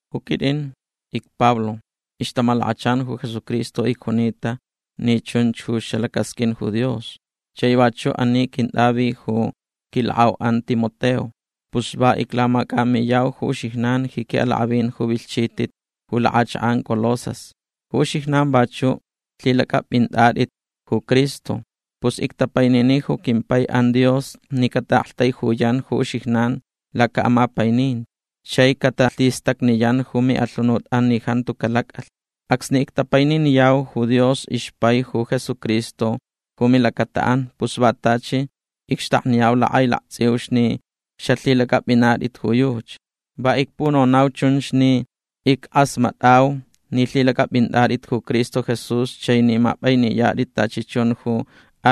Ju quitʼin icPablo. Ixtamalakachan ju Jesucristo icjunita ni chunch ju xalacasqʼuin ju Dios. Chai vachuʼ ani quintʼavi ju quilakʼauʼan Timoteo. Pus va iclamacʼamiyau ju uxijnan ji quiʼalakʼavin ju vilhchitʼit ju lakʼachakʼan Colosas. Ju uxijnan vachuʼ lhilacʼapʼintʼatʼit ju Cristo. Pus ictapainini ju quimpaiʼan Dios ni cataʼaktaijuyan ju uxijnan lacaʼamapaininti chai catalhistacniyan ju miʼalhunutʼan ni jantu calacʼalh. Acsni ictapaininiyau ju Dios ixpai ju Jesucristo ju milacataʼan pus va tachi icxtakniyau lakʼailaktsʼiuch ni xalhilacʼapʼinatʼit ju yuchi. Va icpunonau chunch ni ickʼasmatʼau ni lhilacʼapʼintʼatʼit ju Cristo Jesús chai ni mapʼainiyatʼit tachi chun ju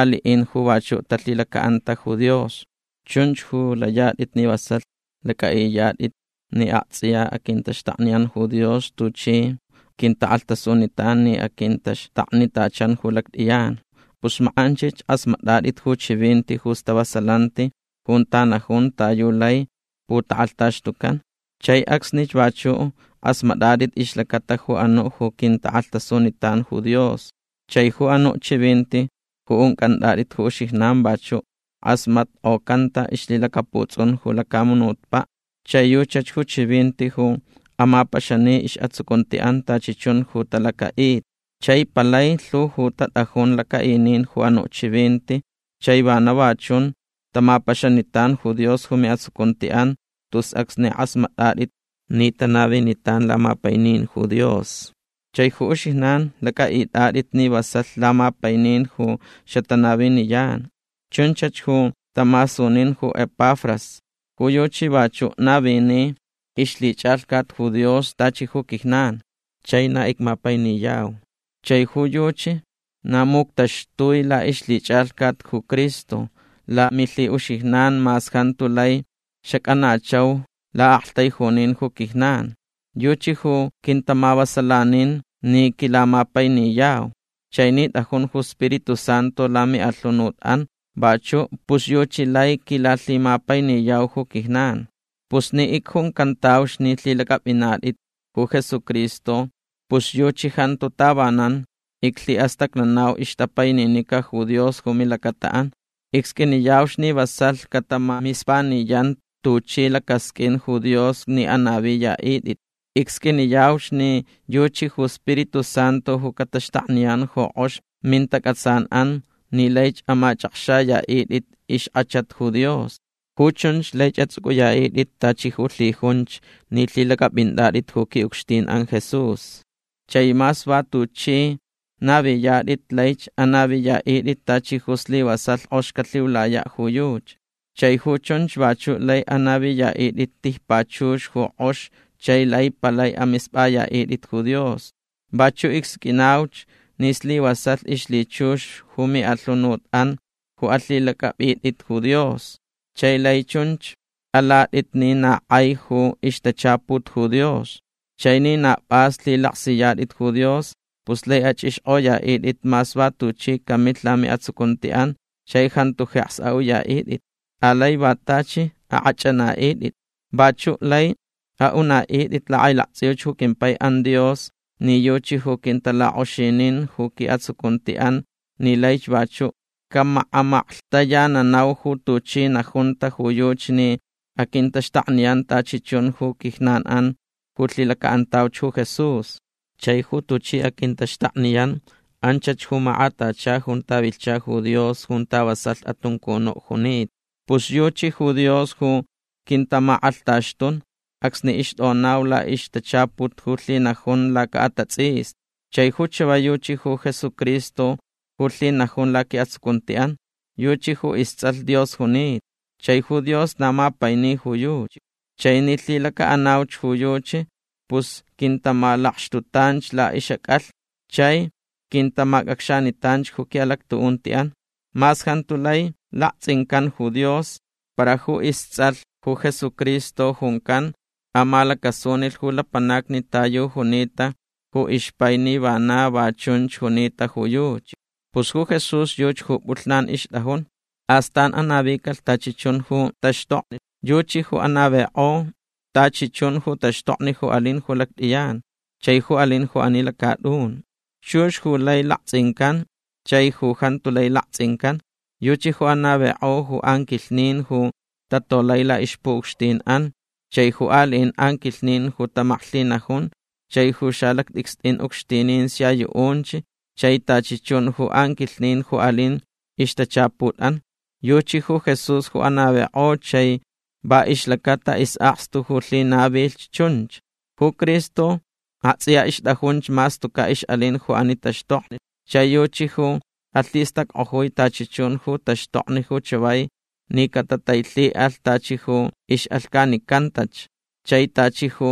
aliʼin ju vachuʼ talhilacaʼanta ju Dios. Chunch ju layatʼit ni vasalh lacʼaʼiyatʼit ni aktsʼiya aquintaxtakniyan ju Dios tuchi quintakʼalhtasunitan ni aquintaxtaknitachan ju lactʼiyan. Pus makʼanchich kʼasmatʼatʼit ju chivinti ju stavasalanti junta najun ta yu lai putakʼalhtaxtucan. Chai acsnich vachuʼ kʼasmatʼatʼit ixlacata ju anuʼ ju quintakʼalhtasunitan ju Dios. Chai ju anuʼ chivinti ju uncʼantʼatʼit ju uxijnan vachuʼ kʼasmatkʼocanta ixlhilacaputsʼun ju lacamunutpaʼ. Chai yuchach ju chivinti ju amapaxani isʼatsucuntiʼan tachi chun ju talacaʼita. Chai palai lhu ju tatʼajun lacaʼinin ju anuʼ chivinti. Chai vana va chun tamapaxanitan ju Dios ju miʼatsucuntiʼan tus acsni kʼasmatʼatʼit ni tanavinitan lamapainin ju Dios. Chai ju uxijnan lacʼaʼitʼatʼit ni vasalh lamapainin ju xatanaviniyan. Chunchach ju tamasunin ju Epafras. Ju yuchi vachuʼ navini ixlhichʼalhcat ju Dios tachi ju quijnan. Chai na icmapainiyau. Chai ju yuchi na muctaxtui laʼixlhichʼalhcat ju Cristo lamilhiʼuxijnan mas jantu lai xacʼanachau laʼaktaijunin ju quijnan. Yuchi ju quintamavasalanin ni quilamapainiyau. Chai ni tʼajun ju Spiritu Santu lamiʼalhunutʼan vachuʼ pus yuchi lai quilalhimapainiyau ju quijnan. Pus ni icjuncantauch ni lhilacʼapʼinatʼit ju Jesucristo pus yuchi jantu tavanan iclhiʼastacnanau ixtapaininica ju Dios ju milacataʼan. Icsqʼuiniyauch ni vasalh catamamispaniyan tuchi lacasqʼuin ju Dios ni anaviyaʼitʼit. Icsqʼuiniyauch ni yuchi ju Spiritu Santu ju cataxtakniyan ju kʼox mintacʼatsanʼan ni laich amachʼakxayaʼitʼit ixkʼachat ju Dios. Ju chunch laich atsʼucʼuyaʼitʼit tachi ju lhijunch ni lhilacʼapʼintʼatʼit ju quiʼucxtinʼan Jesús. Chai mas va tuchʼi naviyatʼit laich anaviyaʼitʼit tachi ju slivasalh kʼox calhiulayaʼ ju yuchi. Chai ju chunch vachuʼ lai anaviyaʼitʼit tijpachux ju kʼox chai lai palai amispʼayaʼitʼit ju Dios. Vachuʼ icsqʼuinauch ni slivasalh ixlhichux ju miʼalhunutʼan ju alhilacʼapʼitʼit ju Dios. Chai lai chunch alatʼit ni na kʼai ju ixtachaput ju Dios. Chai ni na pʼas lhilaksiyatʼit ju Dios pus lai achʼixkʼoyaʼitʼit mas va tuchi camilh lamiʼatsucuntiʼan chai jantu jeks aʼuyaʼitʼit. Alai va tachi akʼachʼanaʼitʼit. Vachuʼ lai aʼunaʼitʼit lakʼailaktsʼiuch ju quimpaiʼan Dios ni yuchi ju quintalakʼoxinin ju quiʼatsucuntiʼan ni laich vachuʼ camakʼamaklhtayananau ju tuchi najunta ju yuchi ni aquintaxtakniyan tachi chun ju quijnanʼan ju lhilacaʼantauch ju Jesús. Chai ju tuchi aquintaxtakniyan anchach ju makʼatacha junta vilhcha ju Dios junta vasalh atuncunuʼ junita. Pus yuchi ju Dios ju quintamakʼalhtaxtun acsni ixtʼonaucaʼ laʼixtachaput ju lhinajun lacaʼatatsʼisni. Chai ju chavai yuchi ju Jesucristo ju lhinajun laquiʼatsucuntiʼan. Yuchi ju istsʼalh Dios junita. Chai ju Dios na mapaini ju yuchi. Chai ni lhilacaʼanauch ju yuchi pus quintamalakxtutanch laʼixʼacʼalhni. Chai quintamacʼacxanitan ju quiʼalactuʼuntiʼan. Mas jantu lai laktsʼincan ju Dios para ju istsʼalh ju Jesucristo juncan amalacasunilh ju lapanacni ta yu junita ju ixpai ni vana va chunch junita ju yuchi. Pus ju Jesús yuchi ju pʼulh ixtʼajun. Astan anavicalh tachi chun ju taxtokni. Yuchi ju anavikʼo tachi chun ju taxtokni ju alin ju lactʼiyan chai ju alin ju ani lacatʼun. Chux ju lai laktsʼincan chai ju jantu lai laktsʼincan. Yuchi ju anavikʼo ju anquilhnin ju tatolai laʼixpuʼucxtinʼan chai ju aliʼin anquilhnin ju tamaklhinajun chai ju xalactʼicstʼin ucxtinin sia yuʼunch chai tachi chun ju anquilhnin ju alin ixtachaputʼan. Yuchi ju Jesús ju anavikʼo chai va ixlacata isʼakstu ju lhinavilh chunch. Ju Cristo aktsʼiya ixtʼajunch mas tucaʼ ixʼalin ju ani taxtokni. Chai yuchi ju alhistackʼojui tachi chun ju taxtokni ju chavai ni catatailhiʼalh tachi ju ixʼalhcanicantach. Chai tachi ju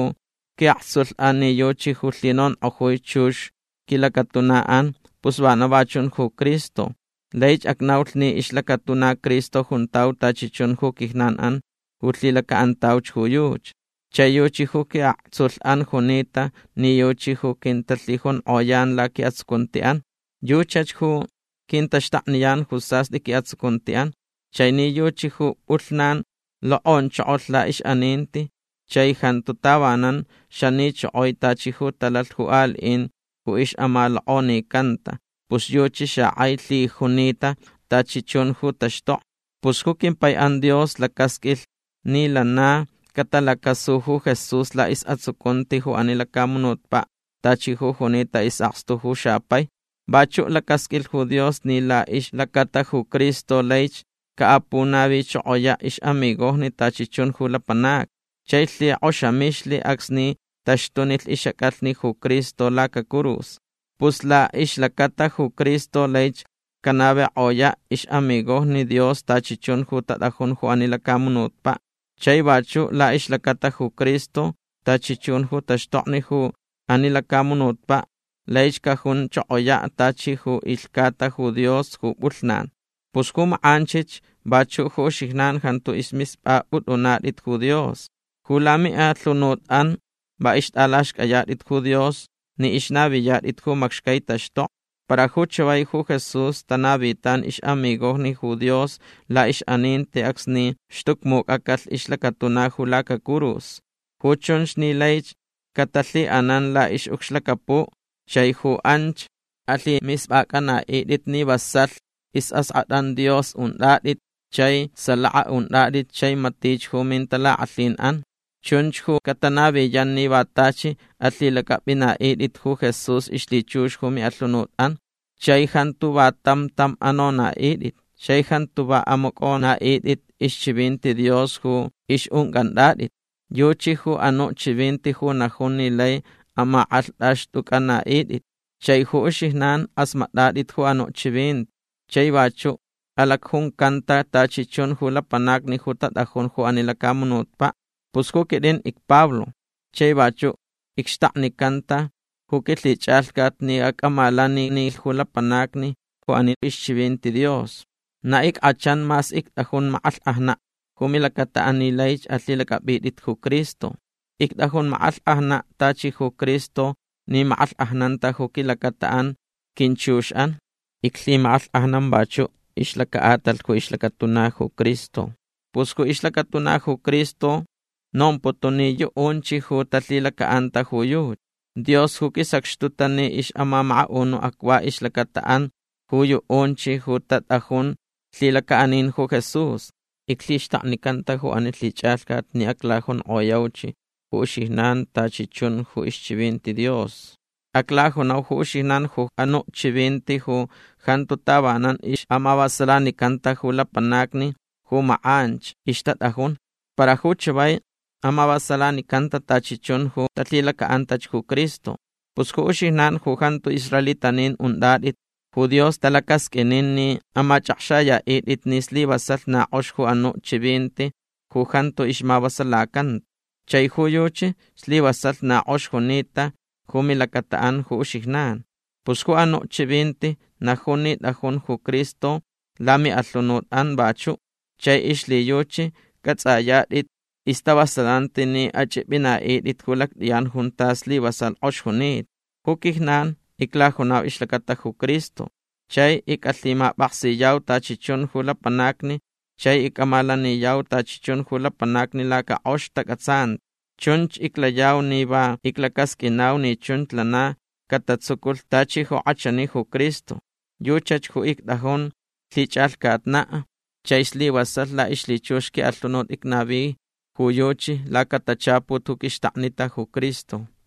quiʼaktsulhʼan ni yuchi ju lhinonkʼojui chux quilacatunaʼan pus vana va chun ju Cristo. Laich acnaulh ni ixlacatuna Cristo juntau tachi chun ju quijnanʼan ju lhilacaʼantauch ju yuchi. Chai yuchi ju quiʼaktsulhʼan junita ni yuchi ju quintalhijunkʼoyan laquiʼatsucuntiʼan. Yuchach ju quintaxtakniyan ju sastʼi quiʼatsucuntiʼan. Chai ni yuchi ju pʼulhnan lokʼonchokolh laʼixʼaninti chai jantu tavanan xanichokoi tachi ju talalh ju aliʼin ju ixʼamalokʼonicanta pus yuchi xakʼai lhijunita tachi chun ju taxtokni. Pus ju quimpaiʼan Dios lacasqʼuilh ni lana catalacasu ju Jesús laʼisʼatsucunti ju ani lacamunutpaʼ tachi ju junita isʼakstu ju xapai. Vachuʼ lacasqʼuilh ju Dios ni laʼixlacata ju Cristo laich caʼapunavichokoyaʼ ixʼamigojni tachi chun ju lapanacni. Chai lhikʼoxamixlh acsni taxtunilh ixʼacʼalhni ju Cristo lacacurus. Pus laʼixlacata ju Cristo laich canavikʼoyaʼ ixʼamigojni Dios tachi chun ju tatʼajun ju ani lacamunutpaʼ. Chai vachuʼ laʼixlacata ju Cristo tachi chun ju taxtokni ju ani lacamunutpaʼ laich cajunchokoyaʼ tachi ju ilhcata ju Dios ju pʼulhnan. Pus ju makʼanchich vachuʼ ju uxijnan jantu ismispʼapʼutʼunatʼit ju Dios. Ju lamiʼalhunutʼan va ixtʼalaxcʼayatʼit ju Dios ni ixnaviyatʼit ju macxcai taxtokni. Para ju chavai ju Jesús tanavitan ixʼamigojni ju Dios laʼixʼaninti acsni xtucmucʼacalh ixlacatuna ju lacacurus. Ju chunch ni laich catalhiʼanan laʼixʼucxlacapuʼ chai ju anch alhimispʼacʼanaʼitʼit ni vasalh isʼaskʼatʼan Dios untʼatʼit chai salaka untʼatʼit chai matich ju mintalakʼalhinʼan. Chunch ju catanaviyan ni va tachi alhilacʼapʼinaʼitʼit ju Jesús ixlhichux ju miʼalhunutʼan chai jantu va tam tam anonaʼitʼit chai jantu va amacʼonaʼitʼit ixchivinti Dios ju ixʼuncʼantʼatʼit. Yuchi ju anuʼ chivinti ju najun ni lai amakʼalhtʼaxtʼucʼanaʼitʼit. Chai ju uxijnan kʼasmatʼatʼit ju anuʼ chivinti chai vachuʼ alacjuncanta tachi chun ju lapanacni ju tatʼajun ju ani lacamunutpaʼ. Pus ju quitʼin icPablo. Chai vachuʼ icxtaknicanta ju quilhichʼalhcat ni acʼamalaninilh ju lapanacni ju ani ixchivinti Dios. Na ickʼachan mas ictʼajun makʼalhkʼajnaʼ ju milacataʼan ni laich alhilacʼapʼitʼit ju Cristo. Ictʼajun makʼalhkʼajnaʼ tachi ju Cristo ni makʼalhkʼajnanta ju quilacataʼan quinchuxʼan. Iclhimakʼalhkʼajnan vachuʼ ixlacaʼatalh ju ixlacatuna ju Cristo. Pus ju ixlacatuna ju Cristo nomputun ni yuʼunch ju talhilacaʼanta ju yuchi. Dios ju quisacxtuta ni amamakaʼunuʼ acva ixlacataʼan ju yuʼunch ju tatʼajun lhilacaʼanin ju Jesús. Iclhixtaknicanta ju ani lhichʼalhcat ni aclajunkʼoyauch ju uxijnan tachi chun ju ixchivinti Dios. Aclajunau ju uxijnan ju anuʼ chivinti ju jantu tavanan ixʼamavasalanicanta ju lapanacni ju makʼanch ixtatʼajun. Para ju chavai amavasalanicanta tachi chun ju talhilacaʼantach ju Cristo. Pus ju uxijnan ju jantu israelitanin untʼatʼit ju Dios talacasqʼuinin ni amachʼakxayaʼitʼit ni slivasalh na kʼox ju anuʼ chivinti ju jantu ixmavasalacanta. Chai ju yuchi slivasalh na kʼox junita ju milacataʼan ju uxijnan. Pus ju anuʼ chivinti najun ni tʼajun ju Cristo lamiʼalhunutʼan vachuʼ. Chai ixlhiyuchi cʼatsʼayatʼit istavasalanti ni achʼipʼinaʼitʼit ju lactʼiyan junta slivasalh kʼox junita. Ju quijnan iclajunau ixlacata ju Cristo. Chai icʼalhimapʼaksiyau tachi chun ju lapanacni chai icʼamalaniyau tachi chun ju lapanacni lacakʼox tacʼatsanti. Chunch iclayau ni va iclacasqʼuinau ni chunch lana catatsuculh tachi ju kʼachani ju Cristo. Yuchach ju ictʼajun lhichʼalhcatnaʼ chai slivasalh laʼixlhichux quiʼalhunut icnavi ju yuchi lacatachaput ju quixtakni ju Cristo.